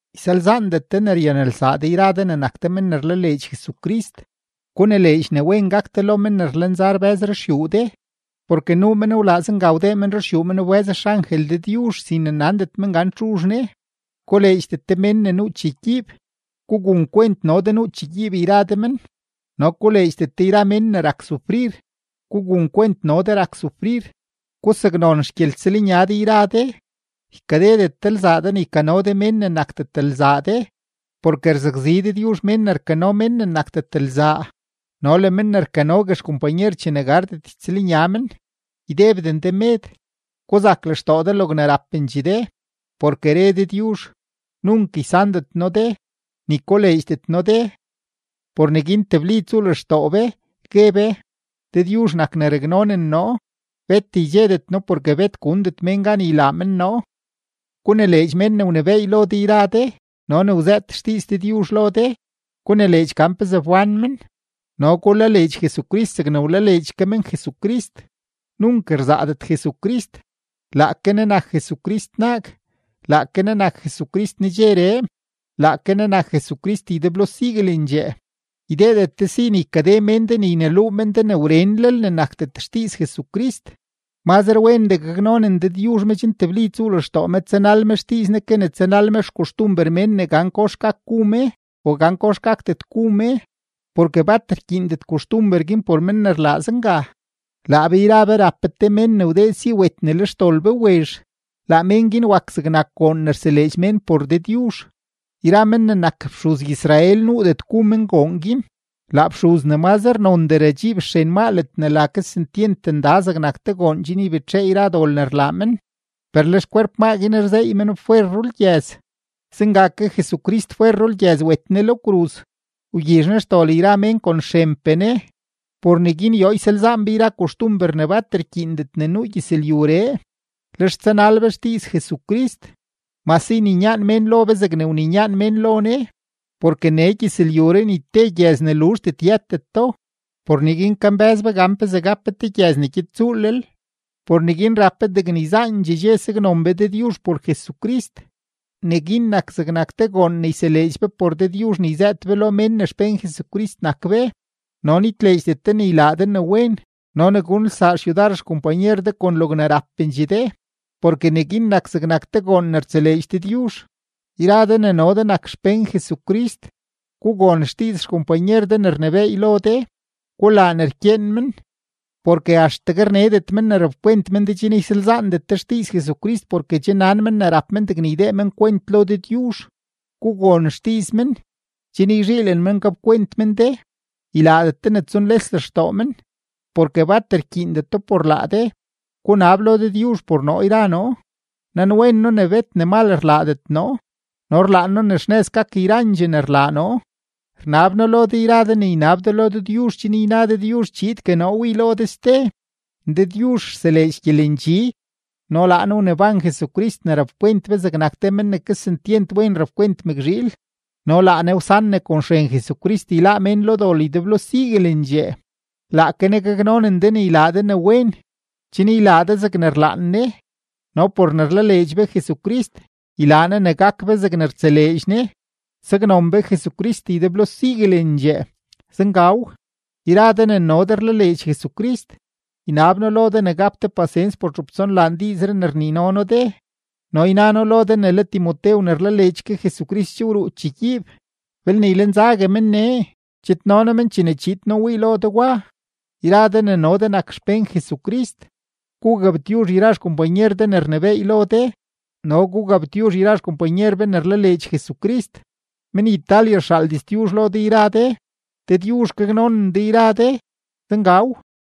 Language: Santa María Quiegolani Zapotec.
Ysalzaandet de ne ryanelsaa de yra de ne nak de men ne rlaleedx Jesucrist. Gunileedx ne wen gak de lo mén ne rlenza rbë́z ruxyuu de, porke nuu mén wlaa zenga wdee men ruxyuu men wbë́z xangel Dëdyuzh sin ne nandet men gan txuzh ne. Koleedxdet de mén ne nuu chegyiib, gugun kwent no de nuu chegyiib yra de men no koleedxdet de yra mén ne rak sufrir, gugun kwent no de rak sufrir. Gusaknon xgyeltsëlnya de yra de, ykadedet de lzaa de ne ykano de mén ne nakdet lzaa de, porke rzakzi Dëdyuzh mén ne rkano mén ne nakdet lzaa no le men ne rkanogue xkompanyer chene gardet ytsëlnya men. Ydebden de med; guzak lextoo de logne rapendxee de, porke re Dëdyuzh: “Nunk ysandet noo de, ni koleedxdet noo de.” Por neguin tebli tsuu lextoo be, gue be: Dëdyuzh nak ne raknonen noo; bet ydxedet noo porke bet gundet mén gan ylaa mén noo. Gunileedx men ne wnebééy lo de yra de no ne wzëët xdiiz Dëdyuzh lo de, gunileedx gan pezee wbán men no gulaleedx Jesucrist zegne wlaleedx ke men Jesucrist. Nunk rzaadet Jesucrist, laake Ne nak Jesucrist naag, laake Ne nak Jesucrist nedxeree, laake Ne nak Jesucrist ydeblo siguelendxee. Ydeedet de si ne ykade mén de ne yneluu men de ne wrenlel ne nakdet xdiiz Jesucrist; mazre wendee gaknonen Dëdyuzh me chen tebli tsuu lextoo me tsanal me xdiiz Ne ke ne tsanal me xkoxtumber mén ne gan kox gak gu me o gan kox gakdet gu me, porke bat rkyiindet koxtumber guin por men ne rlaa zenga. Laa be yra be rap be te mén ne wdee si wet ne le xdol be wezh, laa mén guin wak zegnak goon ne rseleedx mén por Dëdyuzh; yra men ne nak fxuz-Israel nuudet gu men goon guin. Laa fxuz ne mazre nondee radxiib xren maa ledne la Kesentyent Nda zegnak te goon chen ybetxee yra dol ne rlaa men, per le xkwerp maa guin rzeey meno fwer rulgyëz. Zenga ke Jesucrist fwer rulgyëz wet Ne lo kruz, wgyizh Ne xdol yra mén kon xrenpee Ne. Por neguin yoo ysalzaan be yra koxtumber ne bat rkyiindet ne nuu gyëzlyuree, lex tsanal be xdiiz Jesucrist, mase yninyaan mén lo be zegne wninyaan mén lo Ne. Porke nee gyëzlyuree ni te gyëz ne luzhdet yëteto, por neguin kambë́z be gan pezee gap be te gyëz ne gyed tsuulel. Por neguin rap be degne yzaandxee dxe saknon be Dëdyuzh por Jesucrist. Neguin nak zegnak te goon ne yseleedx be por Dëdyuzh ne yzëët be lo mén ne xpén Jesucrist nak be. No nitleedxdet de ne ylaa de ne wen no ne gunelsaa xyudar xkompanyer de kon logne rapendxee de; porke neguin nak zegnak te goon ne rtseleedx Dëdyuzh. Yra de ne no de nak xpén Jesucrist, gugon xdiiz xkompanyer de ne rnebééy lo de, gulaa ne rkyeen men, porke axtegue rnedet men ne rapkwent men de chen ysalzaandet de xdiiz Jesucrist porke che nan men ne rap men degne ydee men kwent lo Dëdyuzh. Gugon xdiiz men, chen yzhiilen men gapkwent men de, ylaadet de ne tsunles lextoo men, porke bat rkyiindeto por laa de. Gunab lo Dëdyuzh por noo yra noo; nanwen noo ne bet ne mal rlaadet noo no rlaan noo ne xnëz gak yrandxee ne rlaa noo. Rnab noo lo de yra de ne ynab de lo Dëdyuzh chen yna Dëdyuzh chiidgue noo wii lo de ste. Dëdyuzh rseleedx gyelendxi no laa Ne wneban Jesucrist ne rapkwent be zegnak te men ne kesentyent wen rapkwent mëkzhiil no laa Ne wsan ne kon xren Jesucrist yláá mén lo dol ydeblo siguelendxee, laake Ne gaknonen de ne ylaa de ne wen, chen ylaa de zegne rlaan Ne, no por ne rlaleedx be Jesucrist, ylaa Ne ne gak be zegne rtseleedx Ne. ¡Saknon be Jesucrist ydeblo siguelendxee! Zengaw. Yra de ne no de rlaleedx Jesucrist, ynab noo lo de ne gap de pasens por txup tsonlaan diizree ne rnino noo de. No yna noo lo de ne le Timotew ne rlaleedx ke Jesucrist che wruu chegyiib; belne ylenzague men nee, chidno noo men chene chiid noo wii lo de wa. Yra de ne no de nak xpén Jesucrist, gugabtyuzh yra xkompanyer de ne rnebééy lo de no gugabtyuzh yra xkompanyer be ne rlaleedx Jesucrist. Men-Italia rxaal diztyuzh lo de yra de. Dëdyuzh gaknonen de yra de. Zengaw.